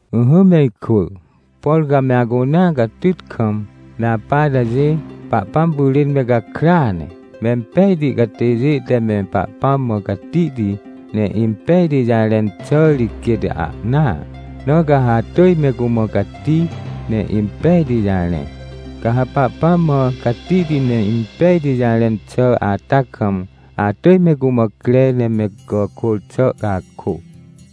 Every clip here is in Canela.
Ỹhỹ me ikwỳ, por ca me acunea catyt kam me apa atajê, Pahpãm pyrên me gakrya ne. Mempejti catêjê te me Pahpãm mã catihti, ne impejti jarẽn xà ri quêt ahnaa. Na ca ha atỳj me cumã cati ne impejti jarẽ. Ca ha Pahpãm mã catihti ne impejti jarẽn xà ata kam, atỳj me cumã cre ne me gàkôr xà cakô,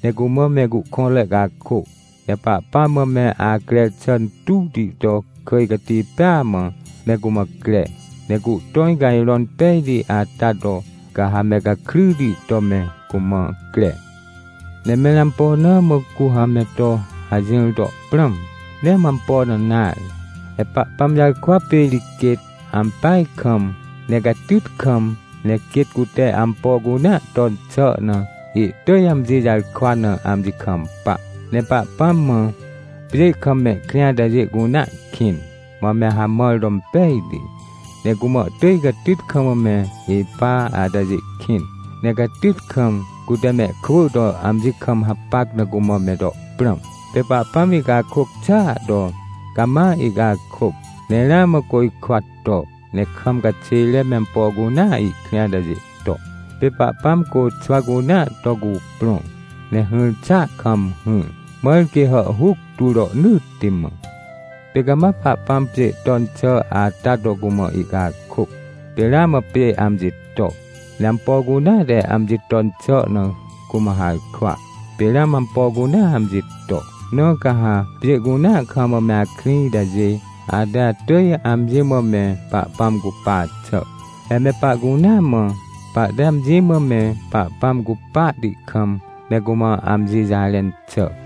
ne cumã cuhkõnre cakô. Ne Pahpãm mã me acrer xà intuwti to kỳj cati pêa mã, me cumã cre, ne cuhtõj cajrõn pejti ata to, ca ha me gakryti to me cumã cre. Ne mẽr ampo na mã cu ha me to hajỹr to prãm? Nee mã ampo na nare, he Pahpãm jarkwa pê ri quêt, ampeaj kam, ne catyt kam, ne quêt cute ampo cunea ton xà na, ihtỳj amji jarkwa na amji kampa. Ne Pahpãm mã, pjê kam mehkrĩ atajê cunea kĩn, mã me hamãr to impejti. Ne cumã ihtỳj catyt kam me ipa atajê kĩn, ne catyt kam, cute mehkwỳ to amji kam hapac na cumã me to prãm. Pê Pahpãm ihcakôc xàa to, cama ihcakôc, ne ramã côjkwa to, ne kam caxêre me ampo cunea ihkrĩ atajê to. Pê Pahpãm côxwa cunea to cuprõ, ne hỹr xàa kam hỹr, mãr quê hàhhuc tu rohnỳtti mã. Pê cama Pahpãm pjê ton xà ata to cumã ihcakôc, pê ramã pjê amji to, ne ampo cunea te amji ton xà na cumã harkwa, pê ramã ampo cunea amji to. Na ca ha pjê cunea kam me akrĩ itajê, ate atỳj amji mã me Pahpãm cupa xà. He me pahcunea mã, pahte amji mã me Pahpãm cupahti kam me cumã amji jarẽn xà.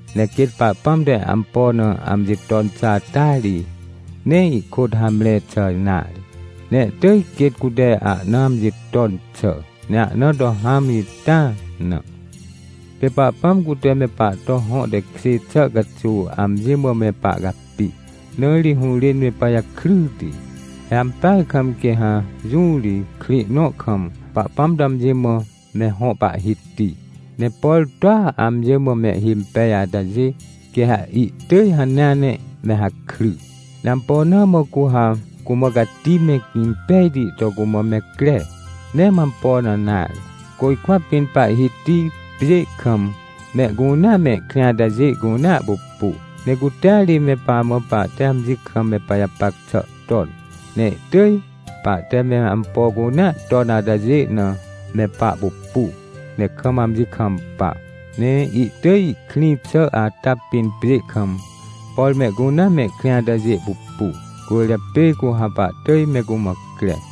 Ne quêt Pahpãm te ampo na amji ton xà ata ri, nee ihkôt hamre xà nare, ne ihtỳj quêt cute ahna amji ton xà, ne ahna to hãm ita na. Pê Pahpãm cute me pahto hõ tekjê xà caxuw amji mã me pahcapi, na ri hũrên me pajakryti. He ampeaj kam quê ha jũ ri, krĩ nõ kam, Pahpãm to amji mã me hõ Pahhiti, ne por toa amji mã mehhimpej atajê, quê ha ihtỳj hanea ne me hakry. Ne ampo na mã cu ha cumã cati me impejti to cumã me cre? Nee mã ampo na nare. Côjkwa pĩn Pahhiti pjê kam mehcunea mehkrĩ atajê cunea pupu. Ne cutea ri me pamã pahte amji kam me pajapac xà ton, ne ihtỳj pahte me ampo cunea ton atajê na me pahpupu, ne kam amji kampa. Ne ihtỳj ihkrĩ xà ata pĩn pjê kam, por mehcunea mehkrĩ atajê pupu, cwỳrjapê cu ha pahtỳj me cumã cre.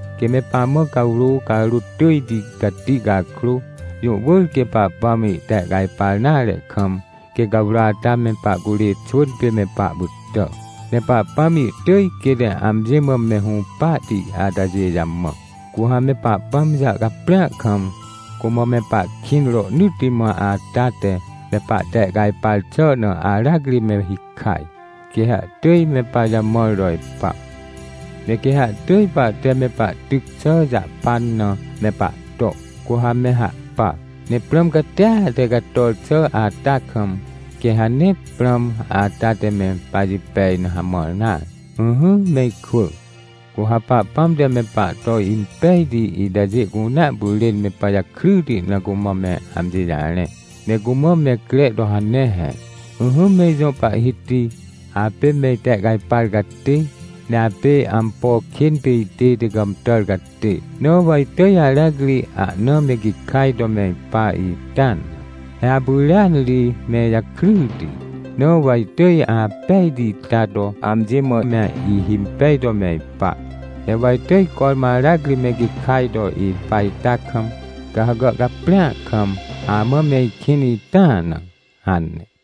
Quê me pamã cawrô carôt tỳjti cati cakrô, jũ wỳr quê Pahpãm ihtehcajpar nare kam, quê cawrô ata me pahcurê xwỳn pê me pahpytà. Ne Pahpãm ihtỳj quêt amji mã me hũpahti atajê jamã. Cu ha me Pahpãm jàhcaprĩa kam, cumã me pahkĩn rohnỳtti mã ata te, me pahtehcajpar xà na aracri me hikaj, quê ha ihtỳj me pajamãr to ipa. Ne quê ha ihtỳj pahte me pahtyc xà jahpan na me pahto, cu ha me hahpa. Ne prãm catia te cator xà ata kam, quê ha nee prãm ata te me pajipej na hamãr nare. Ỹhỹ me ikwỳ, cu ha Pahpãm te me pahto impejti itajê cunea pyrên me pajakryti na cumã me amji jarẽ, ne cumã me cre to hane he. “Ỹhỹ me ijõ Pahhiti, apê me itehcajpar catê, ne apê ampo kên pê itête gàmtàr catê. Na wa itỳj aracri ahna me gikaj to me ipa ita na. He apyrêan ri me ijakryti. Na wa itỳj apejti ita to amji mã me ihimpej to me ipa. Ne wa itỳj cormã aracri me gikaj to ipa ita kam, ca ha gàhcaprĩa kam, amã me ikĩn ita na” hane.